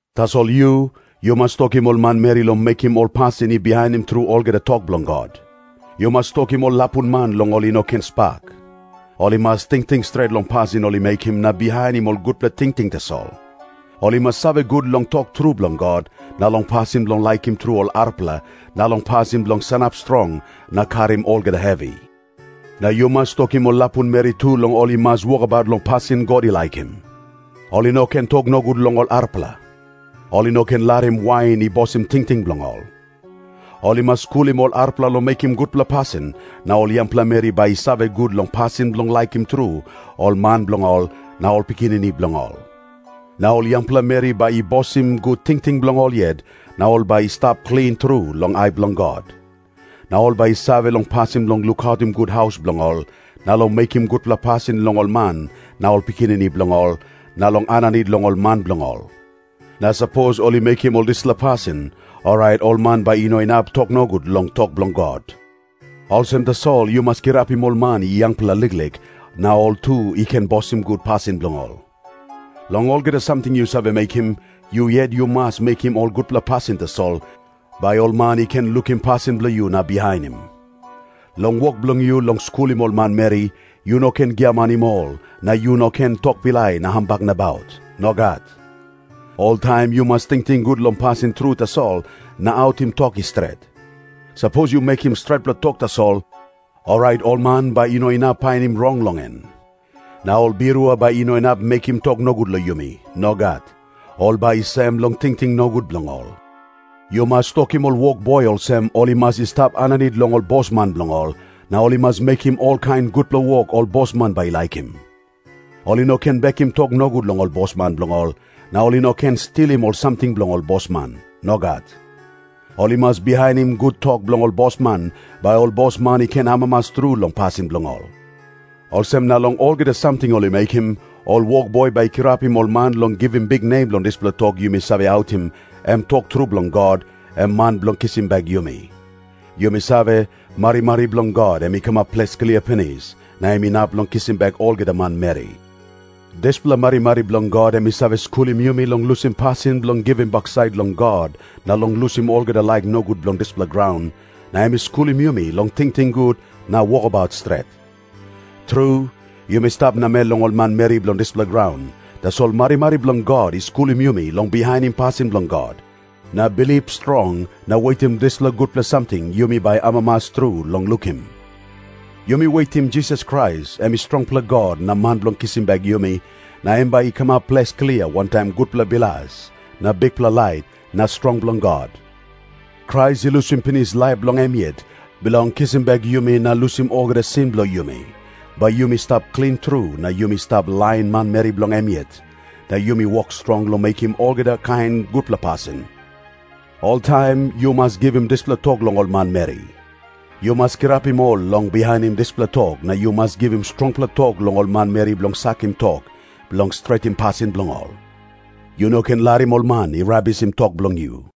Tasol yu, yu mas tokim ol manmeri long mekim ol pasin i bihainim tru olgeta tok bilong God. Yu mas tokim ol lapun man long ol i no ken spak. Ol i mas tingting stret long pasin ol i mekim na bihainim ol gutpela tingting tasol. Ol i mas save gut long tok tru bilong God, na long pasin bilong laikim tru ol arapela, na long pasin bilong sanap strong na karim olgeta hevi. Na yu mas tokim ol lapun meri tu long ol i mas wokabaut long pasin God i laikim. Ol i no ken tok nogut long ol arapela. Ol i no ken larim wain i bosim tingting bilong ol. Ol i mas skulim ol arapela long mekim gutpela pasin, na ol yangpela meri bai i save gut long pasin bilong laikim tru ol man bilong ol na ol pikinini bilong ol. Na ol yangpela meri bai i bosim gut tingting bilong ol yet, na ol bai i stap klin tru long ai bilong God. Na ol bai i save long pasin bilong lukautim gut haus bilong ol, na long mekim gutpela pasin long ol man na ol pikinini bilong ol, na long aninit long ol man bilong ol. Na sapos ol i mekim ol dispela pasin, orait ol man bai i no inap tok nogut long tok bilong God. Olsem tasol yu mas kirapim ol man i yangpela liklik, na ol tu i ken bosim gut pasin bilong ol. Long olgeta samting yu save mekim, yu yet yu mas mekim ol gutpela pasin tasol, bai ol man i ken lukim pasin bilong yu na bihainim. Long wok bilong yu long skulim ol manmeri, yu no ken giamanim ol, na yu no ken tok pilai na hambak nabaut. Nogat. Oltaim yu mas tingting gut long pasin tru tasol na autim tok i stret. Sapos yu mekim stretpela tok tasol, orait ol man bai i no inap painim rong long en. Na ol birua bai i no inap mekim tok nogut long yumi. Nogat. Ol bai i sem long tingting nogut bilong ol. Yu mas tokim ol wokboi olsem, ol i mas i stap aninit long ol bosman bilong ol, na ol i mas mekim olkain gutpela wok ol bosman bai i laikim. Ol i no ken bekim tok nogut long ol bosman bilong ol, na ol i no ken stilim ol samting bilong ol bosman. Nogat. Ol i mas bihainim gut tok bilong ol bosman, bai ol bosman i ken amamas tru long pasin bilong ol. Olsem na long olgeta samting ol i mekim, ol wokboi bai i kirapim ol man long givim biknem long dispela tok yumi save autim, em tok tru bilong God, em Man bilong kisim bek yumi. Yumi save, marimari bilong God em i kamap ples klia pinis, na em inap long kisim bek olgeta manmeri. Dispela marimari bilong God em i save skulim yumi long lusim pasin bilong givim baksait long God na long lusim olgeta laik nogut bilong dispela graun, na em i skulim yumi long tingting gut na wokabaut stret. Tru, yumi stap namel long ol manmeri bilong dispela graun, tasol marimari bilong God i skulim yumi long bihainim pasin bilong God na bilip strong na wetim dispela gutpela samting yumi bai amamas tru long lukim. Yumi wetim Jisas Krais, em strongpela God na Man bilong kisim bek yumi, na em bai i kamap ples klia wantaim gutpela bilas na bikpela lait na strong bilong God. Krais i lusim pinis laip bilong em yet, bilong kisim bek yumi na lusim olgeta sin bilong yumi, bai yumi stap klin tru na yumi stap lain manmeri bilong em yet, na yumi wok strong long mekim olgeta kain gutpela pasin. Oltaim yu mas givim dispela tok long ol manmeri. Yu mas kirapim ol long bihainim dispela tok, na yu mas givim strongpela tok long ol manmeri bilong sakim tok, bilong stretim pasin bilong ol. Yu no ken larim ol man i rabisim tok bilong yu.